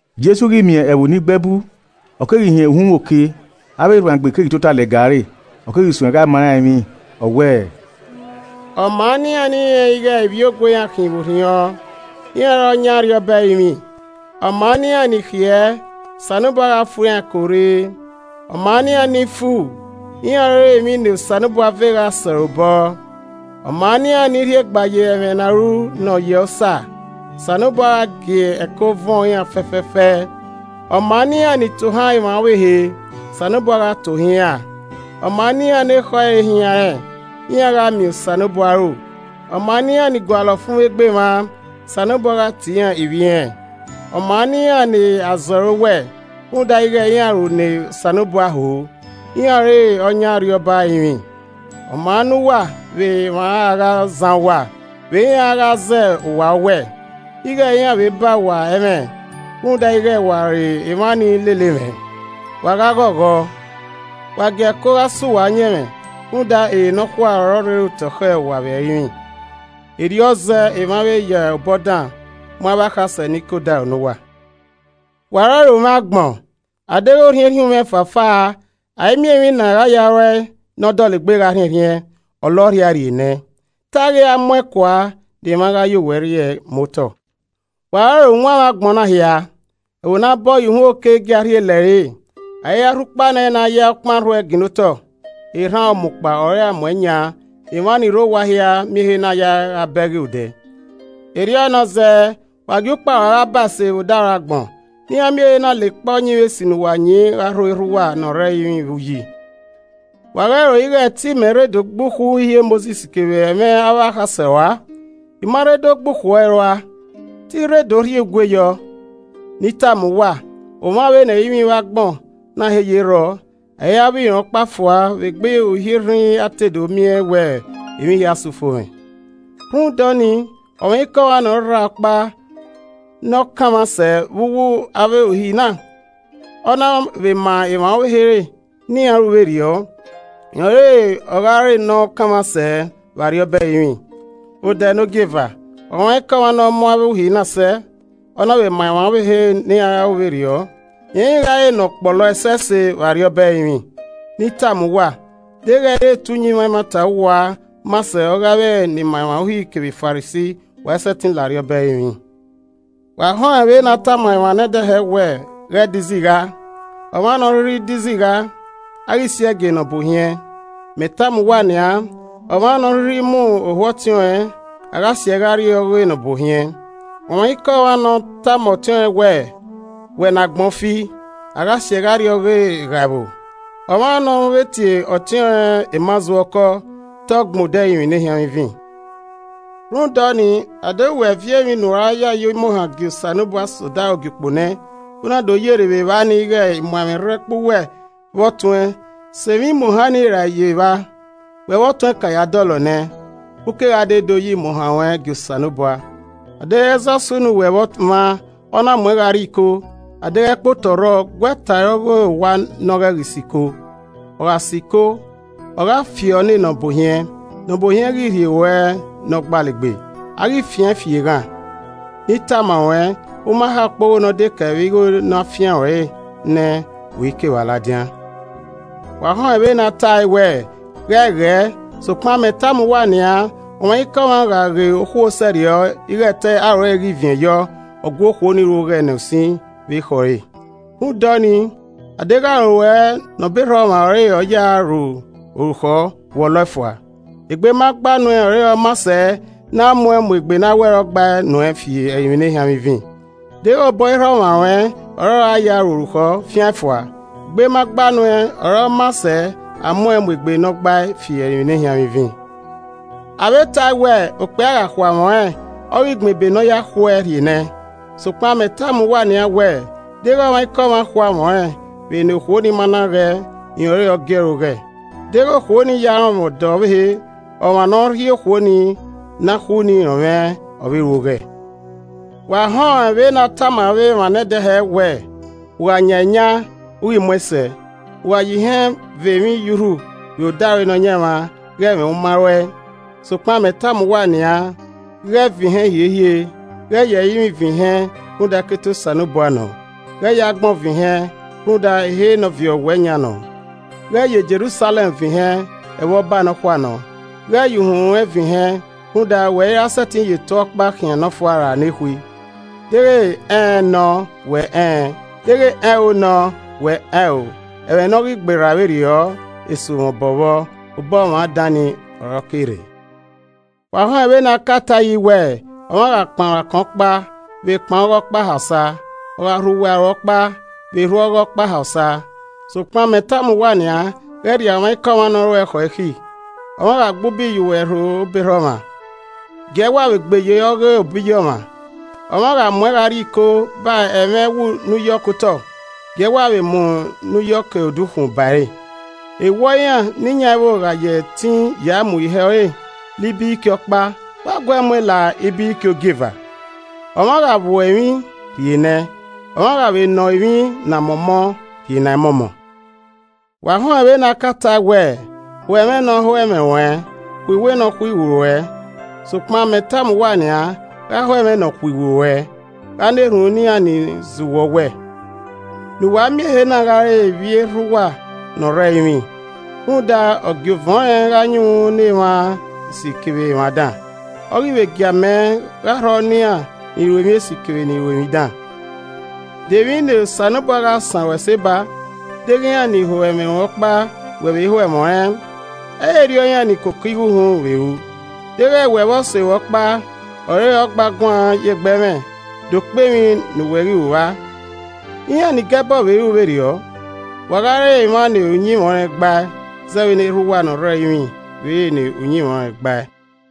Jesu ghi miẹn ẹvbo ni gbe ẹbu, ọ keghi hin uhunmwu oke, avbe erhuanegbe keghi tota lẹga ẹre, ọ keghi suẹn gha ma iran emwi, ọ wẹẹ: “Ọ maa ne iran ni rẹnrẹn ighe ivbiogue iran khin vbe orhiọn, iran ọre ọ yan Arriọba ẹrinmwi! Ọ maa ne iran ni khiẹ, Osanobua gha fu iran ẹko rre! Ọ maa ne iran ni fu, iran ọre emwi ne Osanobua ve gha sẹ ọre obọ! Ọ maa ne iran ni rhiegba ye ẹmwẹ ne a ru nọ yẹ Osa, Osanobua gha gie ẹko vuọn iran fẹfẹfẹ! Ọ maa ne iran ni tohan emwa ọvbehe, Osanobua gha tohan iran! Ọ maa ne iran ne ekhọe ẹre hianrẹn, iran gha miẹn Osanobua aro! Ọ maa ne iran ni gualọ ọfumwegbe emwa, Osanobua gha tie iran ivbi irẹn! Ọ maa ne iran ne a zẹ ọre owẹ, rhunmwuda ighe iran ru ne Osanobua ho, iran ọre ọ yan Arriọba ẹrinmwi. “Ọ maa ne uwa vbe emwa a gha zan uwa, vbe iran a gha zẹ uwa owẹ, ighe iran vbe ba uwa ẹmwẹ, rhunmwuda ighe wa re emwa ni lele mwẹ. Wa gha ghọghọ, wa gie ẹko gha sẹ uwa ọyẹnmwẹ rhunmwuda, ere nọkhua ọre ọ rre otọ khẹ uwa vbe ẹrinmwi. Erriọ zẹe emwa vbe ya obọ dan mu avbe akhasẹ ni ke odaro ne uwa. “Wa ọrọre umwẹ agbọn, a deghẹ orhiẹnrhiẹn umwẹ fafaa, a i miẹn emwi ne a gha ya ru ẹe ne ọ dọlegbe gha rhiẹnrhiẹn, ọ la ọrhiae rrie nẹ. Te a ghi ra mu ẹn kua ne emwa gha ya owẹ rri ẹe mu otọ. “Wa ọrọre uwanmwẹ agbọn na hia, ẹvbo ne a bọ ye uhunmwu oke i gia rhie lẹre. A i ra rhukpa nẹ ne a ya ọkpan rhuẹe ginna otọ, erhan ọmukpa ọre a mu ẹn yan ne emwa ni rre owa hia miẹn ehe na yae gha bẹghe odẹ. Erriọ nọ zẹẹ, wa gie ukpa rua gha ba ẹse vbe odaro agbọn, ne iran miẹn ehe na lekpa uyinmwẹ esi ne uwa yin gha rho erha uwa ne ọ rre ẹrinmwi vbe uyi. “Wa ghẹ ro ighe te imẹ rre do gbe ukhu Uhi e Mosis kevbe ẹmwẹ avbe akhasẹ rua. I ma rre do gbe ukhu ẹre rua, te I rre do rhie ugue yọ. Ne I tama uwa, omwa vbene ẹrinmwi vbe agbọn na he ye rrọọ, a i ra vbọ irọn ọkpa fua vbe egbe uhi rhinrin a te do miẹn wẹ emwi hia sẹ ufomwẹ. Rhunmwuda ọnii, ọmwaikọmwa ne ọ rra ọkpa ne ọ kanmwa sẹ vbe uwu avbe Uhi na, ọ na vbe ma emwa ọvbehe re ne iran ru vberriọ, rẹn ọre ọ gha re ne ọ kanmwa sẹ vbe Arriọba ẹrinmwi. Odẹ nogieva, ọmwaikọmwa ne ọ mu avbe uhi na sẹ, ọ na vbe ma emwa ọvbehe re ne iran ru vberriọ, rẹn ghi gha re ne ọkpọlọ ẹsẹse vbe Arriọba ẹrinmwi. Ne I tama uwa, deghẹ ẹ i re te uyinmwẹ ẹmwata ọwua maa sẹ ọghe avbe ni ma emwa Uhi kevbe Farisi, wa i sẹtin la Arriọba ẹrinmwi. “Wa họn ẹn vbene a tama emwa nẹdẹ hẹ wẹẹ, ‘Ghẹ de izigha, ọmwa ne ọ rhirhi de izigha, a ghi siẹe gie nọbuohiẹn.’ Mẹ tama uwa nian, ọmwa ne ọ rhirhi mu ohu ọtiọnrẹn, a gha siẹe gha rrie ọghe nọbuohiẹn. Ọmwaikọmwa ne ọ tama ọtiọnrẹn wẹẹ, ‘Wẹ ne agbọn fi’ a gha siẹe gha rrie ọghe eghaẹvbo. Ọmwa ne ọ vbe tie ọtiọnrẹn ‘Emazurọkọ’, te ọ gbẹn odẹ ẹrinmwi ne ehianmwẹ ivin. Rhunmwuda ọnii, a deghẹ wẹ viọ emwi ne u ra ya yo imuohan gie Osanobua sẹ odaro ogiukpo nẹ, u na do yerre vbe evba nii ighe imuaẹmwẹ rre ẹkpo uwẹ vbe ọtuẹn, sẹ emwi imuohan ni rae ye evba, wẹ vbe ọtuẹn ka ya dọlọ nẹ, u kegha de do yo imuohan ruẹn gie Osanobua. “A deghẹ ẹzọ sunu ne uwẹ vbe ọmwa, ọ na muẹn gha rrie iko, adeghẹ ẹkpotọ rrọọ, guẹ ta ẹre ọghe owa ne ọ ghẹ ghi sẹ iko. Ọ gha sẹ iko, ọ gha fiọ ne nọbuohiẹn, nọbuohiẹn ghi rhie ruẹ ne ọgbalegbe, a ghi fian an fi eghan. Ne I tama ruẹn, u ma ha ukpogho nọdekẹe vbe igho ne a fian ruẹn re nẹ, u i ke evba ladian. “Wa họn ẹn vbene a tae wẹẹ, ‘Ghẹ ghẹẹ,’ Sokpan mẹ tama uwa nian, ọmwaikọmwa gha ghe okhuo sẹrriọ ighe te aro ẹre ghi viẹn yọ, ọ gu okhuo ni ru oghẹ nẹ usin vbe ekhọe ẹre. Rhunmwuda ọnii, adeghẹ aro ruẹ ne obọ erha ọmwa ọre ọ ya a ru orukhọ, wọlọe fua. Egbe ma gba nuẹn ọre ọ maa sẹ ne a mu egbe ne a wẹ ọ gba nuẹn fi ẹrinmwi nehianmwivin. Deghẹ obọ erha ọmwa ruẹn ọre ọ ya a ru orukhọ, fiaẹn fua. Egbe ma gba nuẹn ọre ọ maa sẹ a muẹn mu egbe ne ọgbae fi ẹrinmwi nehianmwivin. “Avbe tae wẹẹ, ‘Okpia gha khu amwẹ ọnrẹn, ọ ghi gbẹn ebe ne ọ ya khu ẹe rhie nẹẹn.’ Sokpan mẹ tama uwa nian wẹẹ, deghẹ ọmwaikọmwa khu amwẹ ọnrẹn vbe ne okhuo ni ma na ghẹẹ, rẹn ọre ọ gie ẹre oghẹ, deghẹ okhuo ni ya rọnmwẹ ọdọ ọvbehe. Ọmwa ne ọ rhie okhuo ne a khu ni rọnmwẹ, ọ vbe ru oghẹ. “Wa họn ẹn vbene a tama emwa hẹ ẹghẹ nẹdẹ wẹẹ, ‘U gha yan eyan, u ghi muẹn sẹ, u gha ya ihen ve emwi ye urhu vbe odaro Nọyaẹnmwa, ghe mwẹ u ma ruẹe.’ Sokpan mẹ tama uwa nian, ghẹ vin ihen hiehiere. Ghẹ ya ẹrinmwi vin ihen rhunmwuda ẹkete Osanobua nọ. Ghẹ ya agbọn vin ihẹn, rhunmwuda, ehe ne ọ viọ owẹ yan nọ. Ghẹ ya Jerusalẹm vẹn ihẹn, ẹvbo Ọba Nọkhua nọ. Ghẹ ya uhunmwu ruẹn vin ihen rhunmwuda, wẹ iran sẹtin ya eto ọkpa khian nọfua ra nekhui. Deghẹ ‘Ẹn ẹn’ nọ wẹ ‘Ẹn ẹn’ Deghẹ ‘Ẹn o’ nọ wẹ ‘Ẹn o’ ẹmwẹ ne ọ ghi gberra vberriọ, esu mwẹ obọ vbọ, obọ ọmwa dan ni ọre ọ ke rre. “Wa họn ẹn vbene a ka tae yi wẹẹ, ‘Ọmwa gha kpan ruẹn akọn ọkpa, vbe kpan ọghọe ọkpa ha osa, ogha rhu uwẹ aro ọkpa, vbe rhu ọghọe ọkpa ha osa.’ Sokpan, mẹ tama uwa nian, ghẹ rria ọmwaikọmwa ne ọ ruẹ khọ ikhi. Ọmwa gha gbe ubi ye uwẹ irho obọ erha ọmwa, giee wa vbe gbe ye ọghe obọ iye ọmwa. Ọmwa gha muẹn gha rrie iko ba ẹmwẹ ẹwu ne u yọ ke otọ, gie ẹe wa vbe mu ne u yọ ke odukhunmwu ba ẹre. Ewọe iran ni yan ẹvbo gha ya ẹtin ya mu ihẹ ọre la ibiriki ọkpa, wa guee muẹn la ibiriki ogieva. Ọmwa gha vbuẹ emwi, rhie nẹẹn. Ọmwa gha vbe nọ emwi na mọmọ, rhie nẹẹn mọmọ. “Wa họn ẹn vbene a ka tae wẹẹ, ‘Ho ẹmwẹ ne ọ ho ẹmwẹ ruẹn, khuiwu ne a khuiwu ruẹ.’ Sokpan, mẹ tama uwa nian, gha ho ẹmwẹ nọkhuiwu ruẹ, gha na erhunmwu ne iran ni zẹ uwẹ owẹ. Ne uwa miẹn ehe na gha re ivbi erha uwa ne ọ rre ẹrinmwi. Rhunmwuda, ọ gie ovẹn ọnrẹn gha yunmwu ne emwa esi kevbe emwa dan, ọ ghi vbe gie amẹ gha rhọ ne iran ni ru emwi esi kevbe ni ru emwi dan. De emwi ne Osanobua gha san ruẹn ẹse ba, deghẹ iran ni ho ẹmwẹ ruẹn ọkpa wẹ vbe ho ẹmwẹ ọnrẹn? Ẹ i re erriọ iran ni koko igho uhunmwu vbe ru! Deghẹ wẹ vbe ose ruẹ ọkpa ọre ọ gba guan ye egbe ẹmwẹ, de okpe emwi ne u ghi ru vba? Iran nigẹbọ vbe ru vberriọ. Wa gha re emwa ne uyinmwẹ ọnrẹn gbae, zẹẹ vbene Erha uwa ne ọ rre ẹrinmwi vbe re ne uyinmwẹ ọnrẹn gbae.”